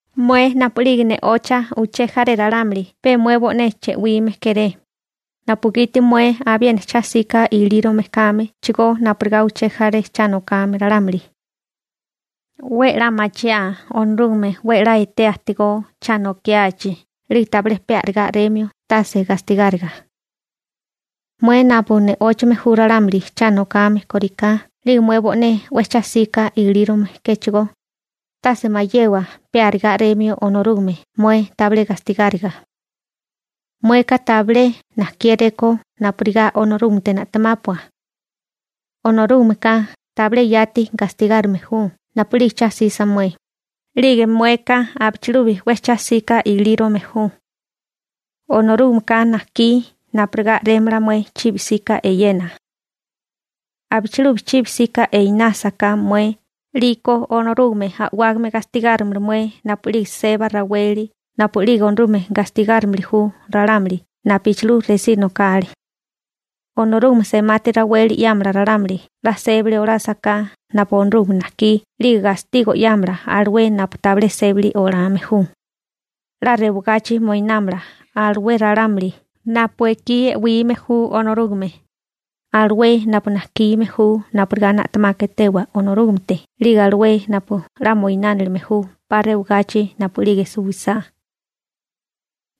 Mué napu'lige ne'ocha uché jaré ralámuli pe mué bo'né che'wime kéré, napugiti mué abiena cha 'sika ilírome kámechigó napurigá uché jaré cha nokame ralámuli. 'We 'la machiaa Onorúgame 'we 'la etea ajtigó cha nokiachi 'lige tabilé pe arigá a'remio tase gastigáriga. Mué napu ne'óchame ju ralámuli cha nokame kóriká 'lige mué bo'né 'we cha 'sika ilírome kéchigó, tase mayewa pe arigá a'remio Onorúgame mué tabilé gastigáriga. Mueka tabilé najkiéréko napurigá Onorúgamete na'temápua. Onorúgameka tabilé yati gastigárime ju napu'lige cha 'sisa mué, 'lige mueka abichilubi 'we cha 'sika ilírome ju. Onorúgameka najkí napurigá a'rémala mué chibi 'sika eyena. Abichilubi chibi 'sika einásaká mué 'liko Onorúgame a'wágame gastigárimala mué napu'lige seba raweli napu'lige Onorúgame gastigárimili ju ralámuli napuchilú resí nokale. Onorúgame semati raweli 'yámala ralámuli 'la sébali olásaká napu Onorúgame najkí 'lige gastigo 'yámala alué napu tabilé sébali olame ju. 'La rewagachi moinámala alué ralámuli napu ekí e'wime ju Onorúgame, alué napu najkime ju napurigá na'temaka etewa Onorúgamete 'lige alué napu 'la moinánilime ju 'pa rewagachi napu'lige suwisá.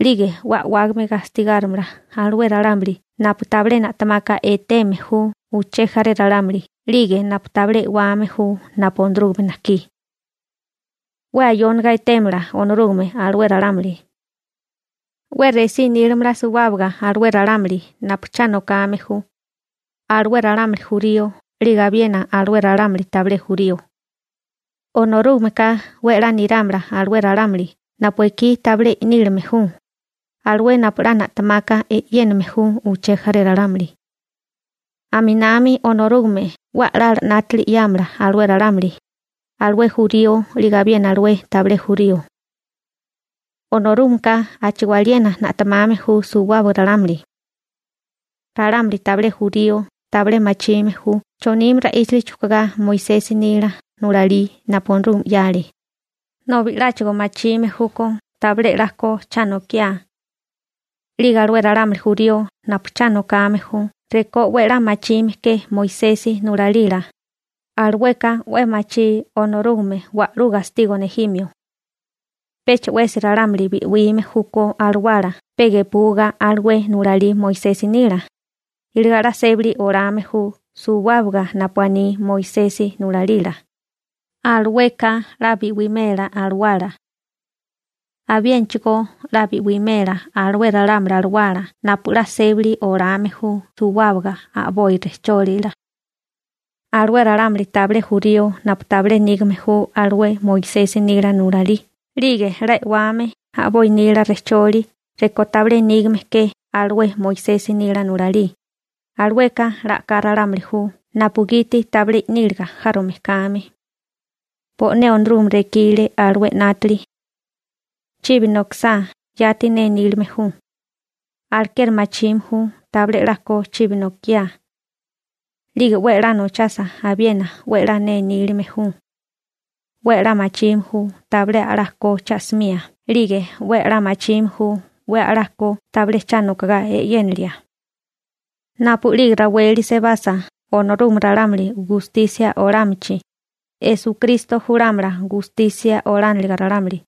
'Lige 'we a'wágame gastigárimala alué ralámuli napu tabilé na'temaka eteme ju uché jaré ralámuli 'lige napu tabilé e'wame ju napu Onorúgame najkí. 'We ayóniga etémala Onorúgame alué ralámuli. 'We resí nílamala suwábaga alué ralámuli napu cha nokame ju, alué ralámuli jurío 'lige abiena alué ralámuli tabilé jurío. Onorúgameka 'we 'la nirámala alué ralámuli napu ekí tabilé i'nílime ju, alué napu 'la na'temaka e'yéname ju uché jaré ralámuli. Aminami Onorúgame 'we a'lala 'nátili 'yámala alué ralámuli, alué jurío 'lige abiena alué tabilé jurío. Onorúgameka a'chigó aliena na'temame ju suwábaga ralámuli. Ralámuli tabilé jurío tabilé machime ju chonime ra'íchali chujkugá Moisesi nila nulalí napu Onorúgame 'yale, nobi 'láchigo machime júkó tabilé 'la ko cha nokiá. 'Lige alué ralámuli jurío napu cha nokame ju rekó 'we a'lá machime ke Moisesi nulalila, alueka 'we machí Onorúgame wa'lú gastigo nejimio. Pecha 'wesi ralámuli bi'wime júkó alawala pe gepuga alué nulalí Moisesi nila, iligá 'la sébali olame ju suwábaga napu aní Moisesi nulalila, alueka 'la bi'wimela alawala. Abiénachigó 'la bi'wimela alué ralámuli alawala napu 'la sébali olame ju suwábaga a'boi rejchólila. Alué ralámuli tabilé jurío napu tabilé nígame ju alué Moisesi nila nulalí 'lige 'la e'wame a'boi nila rejcholi rekó tabilé nígame ke alué Moisesi nila nulalí, alueka 'la a'ká ralámuli ju napugiti tabilé i'níliga járome kame. Bo'né Onorúgame rekile alué 'nátili. Chibi nokasá yati ne nílime ju. Alekeri machime ju tabilé 'la ko chibi nokiá. 'Lige 'we a'lá nochasa abiena 'we 'la ne nílime ju. 'We a'lá machime ju tabilé a'lá ko cha'simía 'lige 'we a'lá machime ju 'we a'lá ko tabilé cha nokogá e'yénilia. Napu'lige raweli sebasa Onorúgame ralámuli gustisia olámachi, Onorúgame Esukristo julámala gaténiliga ralámuli 'yuga.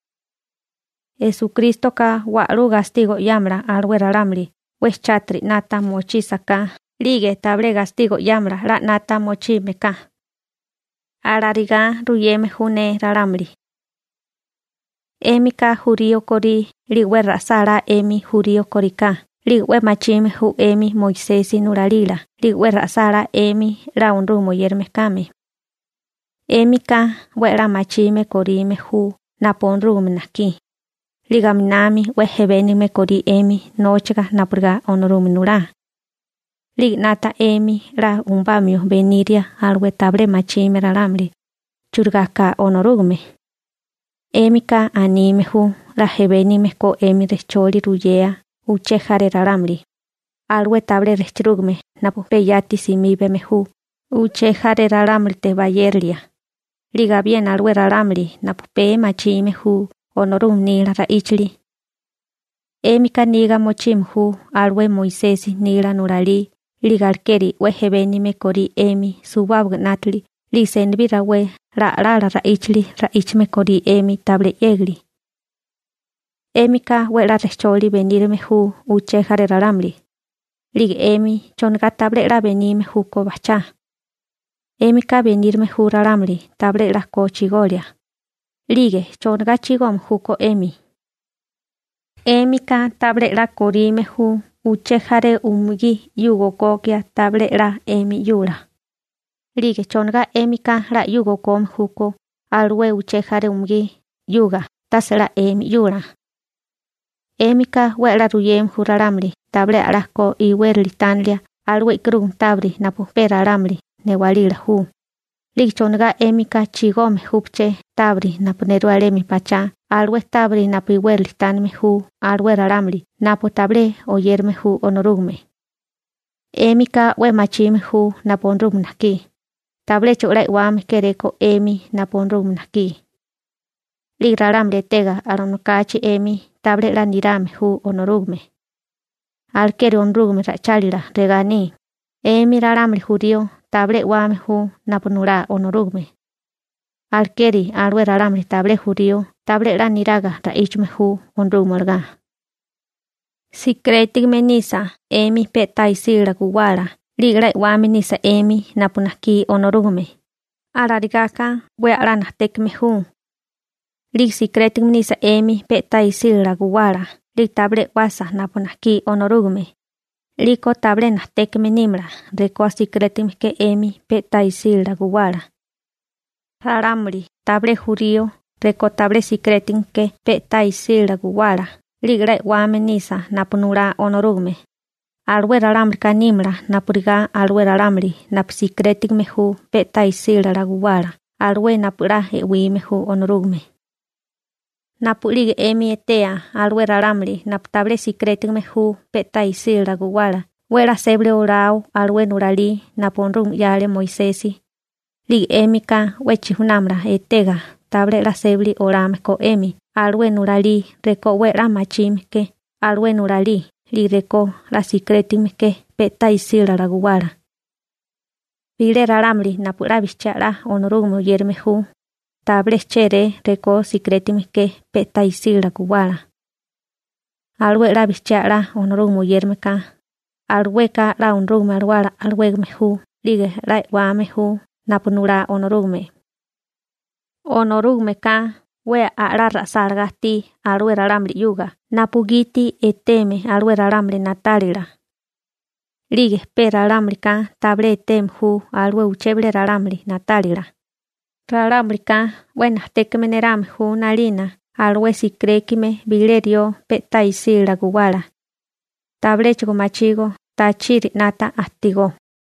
Esukrístoka wa'lú gastigo 'yámala alué ralámuli 'we chátiri 'nata mochísaká 'lige tabilé gastigo 'yámala 'la 'nata mochime ka. Alarigá ruyeme ju ne ralámuli. 'Émika jurío korí 'lige 'we ra'sálá 'emi jurío kóriká 'lige 'we machime ju 'emi Moisesi nulalila 'lige 'we ra'sálá 'emi 'la Onorúgame oyérame kame. 'Émika 'we a'lá machime korime ju napu Onorúgame najkí, 'lige aminami 'we ejbénigame korí 'emi nóchaga napurigá Onorúgame nulá. 'Lige 'nata 'emi 'la umubamio beniria alué tabilé machime ralámuli churigá ka Onorúgame. 'Émika anime ju 'la jebénigame ko 'emi rejcholi ruyea uché jaré ralámuli, alué tabilé rejchirúgame napu pe yati simíbame ju uché jaré ralámulite bayérilia, 'lige abiena alué ralámuli napu pee machime ju Onorúgame nila ra'íchali. 'Émika niga mochime ju alué Moisesi nila nulalí 'lige alekeri 'we ejbénigame korí 'emi suwábaga 'nátili 'lige senibí rawé 'la a'lala ra'íchali ra'íchame korí 'emi tabilé 'yégali. 'Émika 'we 'la rejcholi benírame ju uché jaré ralámuli, ¿'lige 'emi chonigá tabilé 'la benime júkó bajchá? 'Émika benírame ju ralámuli tabilé 'la ko chigolia, ¿'lige chonigá chigome júkó 'emi? 'Émika tabilé 'la korime ju uché jaré umugí 'yuga okokia tabilé 'la 'emi 'yula, ¿'lige chonigá 'émika 'la 'yuga okome júkó alué che jaré umugí 'yuga tase 'la 'emi 'yula? 'Émika 'we a'lá ruyeme ju ralámuli tabilé a'lá ko iwérali tánilia alué e'karúganti tábiri napu pe ralámuli newálila ju, ¿'lige chonigá 'émika chigome júché tábiri napu nerú alemi pachá alué tábiri napu iwérali tánime ju alué ralámuli napu tabilé oyérame ju Onorúgame? 'Émika 'we machime ju napu Onorúgame najkí, tabiléchigo 'la e'wame kéréko 'emi napu Onorúgame najkí. 'Lige ralámuli etega alanokachi 'emi tabilé 'la nirame ju Onorúgame. Alekeri Onorúgame ra'ichálila regá aní: «'Emi ralámuli jurío tabilé e'wame ju napu nulá Onorúgame alekeri alué ralámuli tabilé jurío tabilé 'la niraga ra'íchame ju Onorúgame olagá.» Sikirétigame nisa 'emi pe'tá isílala guwala 'lige 'la e'wame nisa 'emi napu najkí Onorúgame, alarigaka 'we a'lá najtékame ju. 'Lige sikirétigame nisa 'emi pe'tá isílala guwala 'lige tabilé e'wasa napu najkí Onorúgame, 'liko tabilé najtékame nímala rekó sikirétigame ke 'emi pe'tá isílala guwala. Ralámuli tabilé jurío rekó tabilé sikirétigame ke pe'tá isílala guwala 'lige 'la e'wame nisa napu nulá Onorúgame, alué ralámulika nímala napurigá alué ralámuli napu sikirétigame ju pe'tá isílala guwala alué napu 'la e'wime ju Onorúgame. Napu'lige 'emi etea alué ralámuli napu tabilé sikirétigame ju pe'tá isílala guwala 'we 'la sébali olao alué nulalí napu Onorúgame 'yale Moisesi, 'lige 'émika 'we chijunámala etega tabilé 'la sébali olame ko 'emi alué nulalí rekó 'we 'la machime ke alué nulalí 'lige rekó 'la sikirétigame ke pe'tá isílala guwala. Bilé ralámuli napu 'la bijchiá 'la Onorúgame oyérame ju, tabilé chéré rekó sikirétigame ke pe'tá isílala guwala. Alué 'la bijchiá 'la Onorúgame oyérame ka, alueka 'la Onorúgame Alawala alawégame ju 'lige 'la e'wame ju napu nulá Onorúgame. Onorúgameka 'we a'lá ra'sálagá ajtí alué ralámuli 'yuga napugiti etéeme alué ralámuli na'tálila. 'Lige pe ralámulika tabilé eteme ju alué uché bilé ralámuli na'tálila, ralámulika 'we najtékame nerame ju 'nalina alué sikirékime bilé rió pe'tá isílala guwala. Tabiléchigo machígó tachiri 'nata ajtigó.